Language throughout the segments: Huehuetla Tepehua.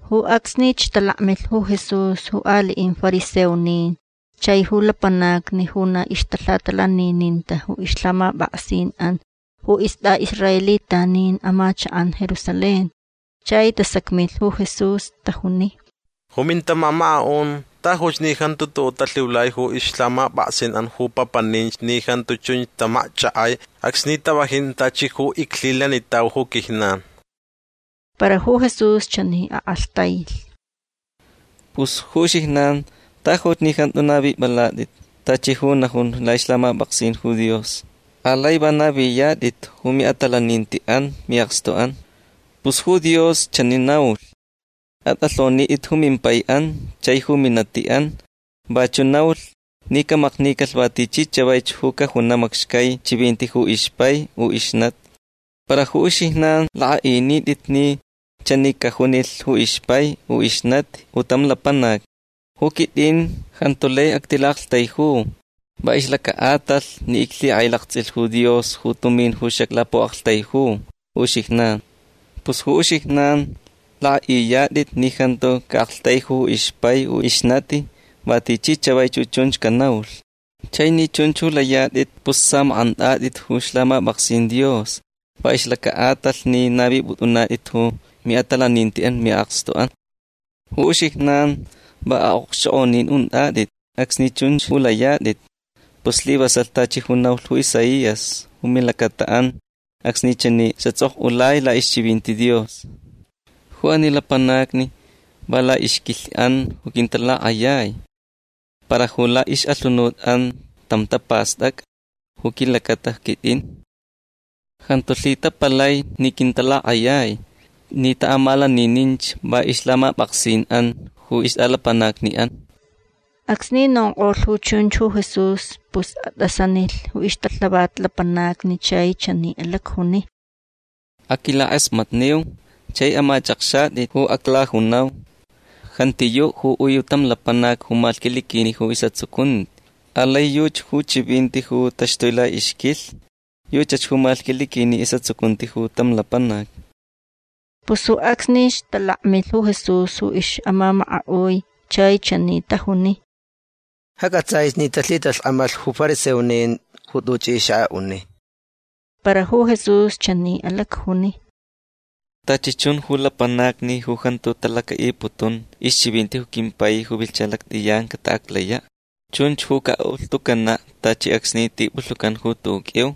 Ju acsnich talakmilh ju Jesús ju aliʼin fariseonin chai ju lapanacni ju na ixtalhatalanininta ju ixlhamapʼaksinʼan ju istʼaʼisraelitanin amachakʼan Jerusalén. Chai tasacmilh ju Jesús. Tajuni: ―Ju mintamamakaʼun tajuch ni jantu tuʼuʼ talhiulai ju ixlhamapʼaksinʼan ju papaninch ni jantu chunch tamakchʼakʼai acsni tavajin tachi ju iclhilanitau ju quijnan. Para ju Jesús chani akʼalhtailh: ―Pus ju uxijnan tajuch ni jantu navipʼalatʼit tachi ju najun laʼixlhamapʼaksin ju Dios. Alai va naviyatʼit ju miʼatalanintiʼan miʼakstuʼan. Pus ju Dios chani naulh: “Atʼalhonitʼit ju mimpaiʼan chai ju minatiʼan”. Vachuʼ naulh ni camaknicalh va tichi chavaich ju cajunaʼ macxcai chivinti ju ixpai u ixnati. Para ju uxijnan lakʼaʼinitʼit ni chani cajunilh ju ixpai u ixnati ju tam lapanac: “Ju quitʼin jantu lai actilaʼaktaiju va ixlacaʼatalh ni iclhikʼailaktsʼilh ju Dios ju tumin ju xaclapuʼaktaiju ju uxijnan”. Pus ju uxijnan lakʼaʼiyatʼit ni jantu caʼaktaiju ju ixpai u ixnati va tichi chavaich ju chunch canaulh. Chai ni chunch ju layatʼit pus samakʼantʼatʼit ju ixlhamapʼaksin Dios va ixlacaʼatalh ni navipʼutʼunatʼit ju miʼatalanintiʼan miʼakstuʼan. Ju uxijnan va aʼokxchokʼonin untʼatʼit acsni chunch ju layatʼit. Pus slivasalh tachi ju naulh ju Isaías ju milacataʼan acsni chani xatsʼokʼulai laʼixchivinti Dios: Ju ani lapanacni va laʼixquilhniʼan quintalakʼayai. Para ju laʼixʼalhunutʼan tam tapastʼacʼa ju quilacata quitʼin. Jantu lhitapalai ni quintalakʼayai ni taʼamalanininch va ixlhamapʼaksinʼan ju ixtʼalapanacniʼan. Acsni nonkʼolh ju chunch ju Jesús pus atʼasanilh ju ixtalhavat lapanacni chai chani alacjuni: ―Aquilakʼasmatniu chai amachʼakxatʼit ju aclajunau. Jantiyuʼ ju ui tam lapanac ju malhquiliquini ju isʼatsucunti. Alai yuchi ju chivinti ju taxtui laʼixquilhni. Yuchach ju malhquiliquini isʼatsucunti ju tam lapanac. Pus ju acsnich talakmilh ju Jesús ju ixʼamamakaʼui chai chani tajuni: ―Ja cʼatsʼaich ni talhitalhkʼamalh ju fariseonin ju tuchʼi xaʼaʼuni. Para ju Jesús chani alacjuni: ―Tachi chun ju lapanacni ju jantu talacaʼiputun ixchivinti ju quimpai ju vilhcha lactʼiyan cataʼaclayaʼ. Chunch ju caʼaʼulhtucanaʼ tachi acsni tipulhucan ju tuʼuʼ qʼuiu.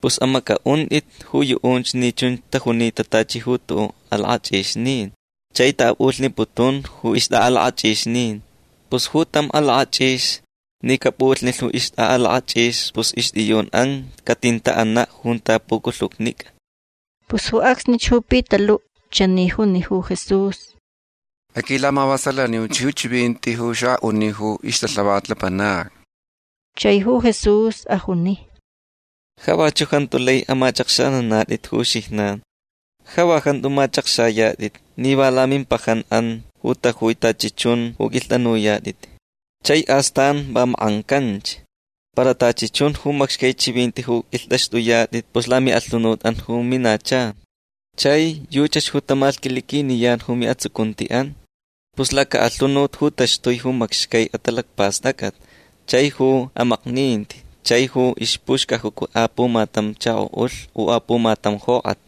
Pus amacʼaʼuntʼit ju yuʼunch ni chunch tajunita tachi ju tuʼuʼ alakʼachʼixnin chai taʼapʼulhniputun ju ixtʼaʼalakʼachʼixnin. Pus ju tam alakʼachʼix ni capʼulhnilh ju ixtʼaʼalakʼachʼix pus ixtʼiyunʼan catintaʼanaʼ junta puculhucnicʼa. Pus ju acsnich ju Pitaluʼ chani juni ju Jesús: ―Aquilamavasalaniuch ju chivinti ju xaʼaʼuni ju ixtalhavat lapanacni. Chai ju Jesús ajuni: ―Ja vachuʼ jantu lai amachʼakxanantʼit ju uxijnan. Ja va jantu machʼakxayatʼit ni va lamimpajanʼan ju tajui tachi chun ju qʼuilhtʼanuyatʼit. Chai astan va makʼancanch. Para tachi chun ju macxcai chivinti ju qʼuilhtʼaxtʼuyatʼit pus lamiʼalhunutʼan ju minacha. Chai yuchach ju tamalhquiliquiniyan ju miʼatsucuntiʼan. Pus lacaʼalhunut ju taxtui ju macxcai atalacpastʼacʼat chai ju amakninti chai ju ixpuxcajuca apumatam chakoʼulh u apumatam jokʼat.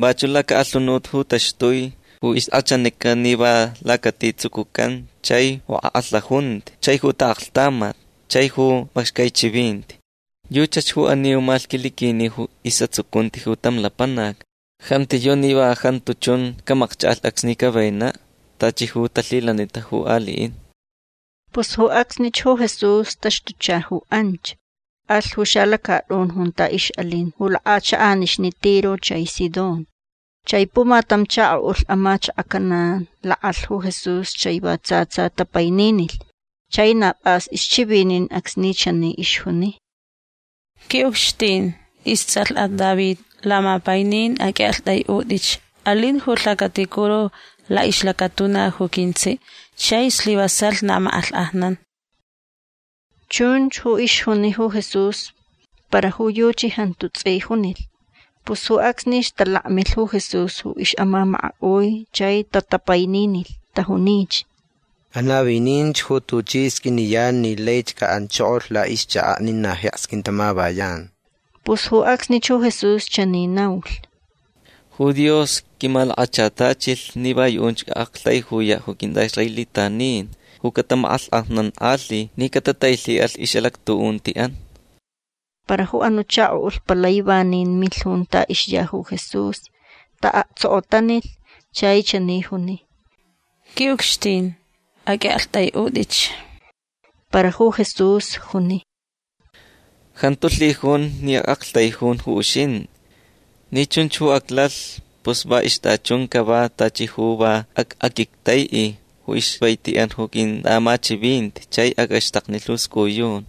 Vachuʼ lacaʼalhunut ju taxtui ju ixkʼachanica ni va lacati tsucucan chai ju akʼalhaʼunti chai ju taʼaklhtamat chai ju macxcai chivinti. Yuchach ju ani ju malhquiliquini isʼatsucunti ju tam lapanac. Jantiyuʼ ni va jantu chun camakchʼakʼalh acsni cavenaʼ tachi ju talhilanita ju aliʼin. Pus ju acsnich ju Jesús taxtucha ju anch. Alh ju xalacatʼun junta ixʼalin ju lakʼachakʼanixni Tiro chai Sidón. Chai pumatam chakoʼulh amachakaʼ Canaán lakʼalh ju Jesús chai va tsa tsa tapaininilh. Chai na pʼas ixchivinin acsni chani ixjuni: ―Quiʼucxtin. Istsʼalhʼat David. Lamapainin aqʼuiʼaktʼaiʼutʼich. Alin ju lhacaticuru laʼixlacatuna ju quintsiʼ chai slivasalh na makʼalhkʼajnan. Chunch ju ixjuni ju Jesús para ju yuchi jantu tsʼi junilh. Pus ju acsnich talakmilh ju Jesús ju ixʼamamakaʼui chai tatapaininilh. Tajunich: ―Anavininch ju tuchi sqʼuiniyan ni laich caʼanchokolh laʼixchakaʼ ni na jeks quintamavayan. Pus ju acsnich ju Jesús chani naulh: ―Ju Dios quimalakachatachilh ni va yuʼunch acʼaʼaktaijuyaʼ ju quintʼaʼisraelitanin ju catamakʼalhkʼajnankʼalhi ni catatailhiʼalh ixʼalactuʼuntiʼan. Para ju anuʼ chakoʼulh palai vanin milh junta ixya ju Jesús. Taʼaktsokotanilh. Chai chani juni: ―Quiʼucxtin aqʼuiʼaktʼaiʼutʼich. Para ju Jesús juni: ―Jantu lhijun ni acʼaktaijun ju uxintʼi. Ni chunch aclalh pus va ixtʼachun cava tachi ju va acʼaquictaiʼi ju ixvaitiʼan ju quintʼaʼamachivinti chai acʼaxtaknilh ju scʼuyun.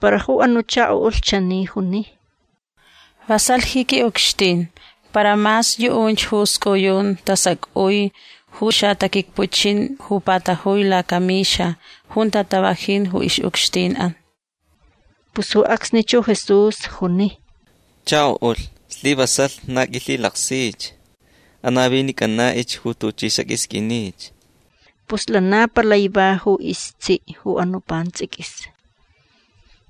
Para ju anuʼ chakoʼulh chani juni: ―Vasalh ji quiʼucxtin. Para mas yuʼunch ju scʼuyun tasacʼui ju xataquicpuchin ju patajui lacamixa junta tavajin ju ixʼucxtinʼan. Pus ju acsnich ju Jesús juni: ―Chakoʼulh slivasalh na qʼuilhilaksich. Anavinicʼanaʼich ju tuchʼi xaqʼuisqʼuinich. Pus lana palai va ju istsiʼ ju anuʼ pantsʼiquis.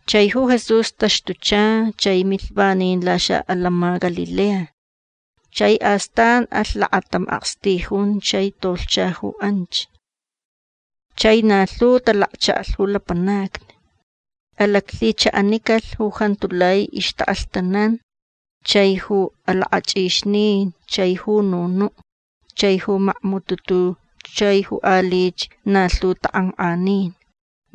Chai ju Jesús taxtucha chai milh vanin laxaʼatantsʼin Galilea. Chai astan alh lakatam akstijun chai tolhcha ju anch. Chai na lhu talakchaʼalh ju lapanacni. Alaclhichaʼanicalh ju jantu lai ixtaʼalhtanan chai ju alakʼachʼixnin chai ju nunuʼ chai ju macmututu chai ju alich na lhu takʼankʼanin.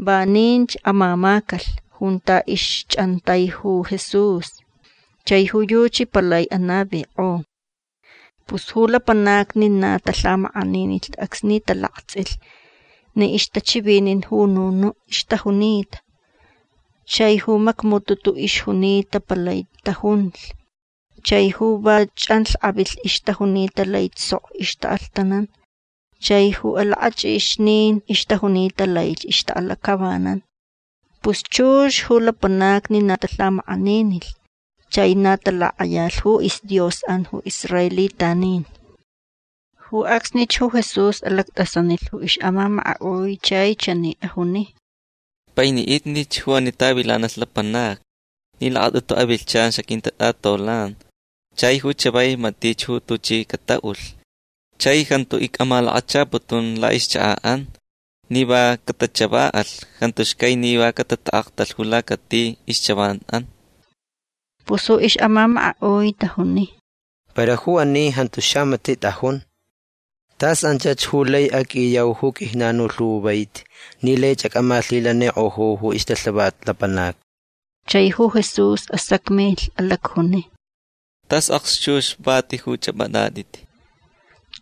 Vaninch amamacalh junta ixchʼantai ju Jesús chai ju yuchi palai anavikʼo. Pus ju lapanacni na talhamakʼaninilh acsni talaktsʼilh ni ixtachivinin ju nunuʼ ixtajunita. Chai ju macmututu ixjunita palai tajunlh. Chai ju va chʼanlhkʼavilh ixtajunita laich sok ixtaʼalhtanan. Chai ju alakʼachʼixnin ixtajunita laich ixtaʼalacʼavanan. Pus chux ju lapanacni na talhamakʼaninilh. Chai na talakʼayalh ju isDiosʼan ju israelitanin. Ju acsnich ju Jesús alactʼasanilh ju ixʼamamakaʼui chai chani ajuni: ―Painiʼitnich ju ani tavilanalh lapanacni ni lakatʼutu avilhchan xaquintatʼatolan chai ju chavai matich ju tuchi cataʼulh. Chai jantu icʼamalakachaputun laʼixchakaʼan ni va catachavaʼalh. Jantu xcai ni va catataʼaktalh ju lacati ixchavanʼan. Pus ju ixʼamamakaʼui tajuni: ―Para ju ani jantu xamatiʼ tʼajun. Tas anchach ju lai acʼiyau ju quijnan ju lhu vaiti ni laich acʼamalhilanikʼoju ju ixtalhavat lapanacni. Chai ju Jesús asacmilh. Alacjuni: ―Tas akxchux vati ju chʼapʼatʼatʼit.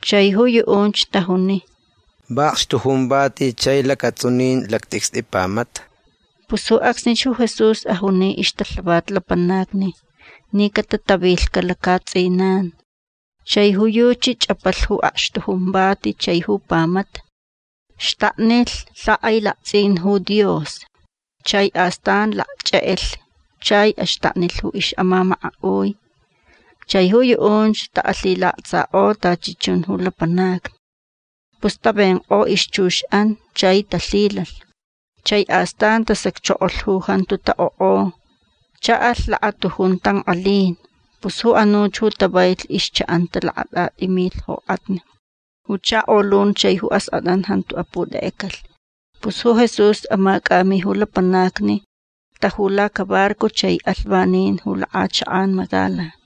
Chai ju yuʼunch tajuni: ―Va akxtujun vati chai lacatsʼunin lactʼicstʼi pamata. Pus ju acsnich ju Jesús ajuni ixtalhavat lapanacni ni catatavilhcaʼ lacaʼatsʼinan. Chai ju yuchi chʼapalh ju akxtujun vati chai ju pamata. Xtaknilh lhakʼailaktsʼin ju Dios. Chai astan lacchʼekʼelh chai axtaknilh ju ixʼamamakaʼui. Chai ju yuʼunch taʼalhilaktsakʼo tachi chun ju lapanacni. Pus tavenkʼo ixchuxʼan chai talhilalh. Chai astan tasacchokolh ju jantu taʼokʼo. Chaʼalh lakatujun tankʼalin. Pus ju anuch ju tavailh ixchaʼanta lakatʼatʼi milh jokʼatni. Ju chakolun chai ju askʼatʼan jantu aputekʼecalh. Pus ju Jesús amacʼami ju lapanacni. Taju lacabarco chai alh vanin ju lakʼachakʼan Magdala.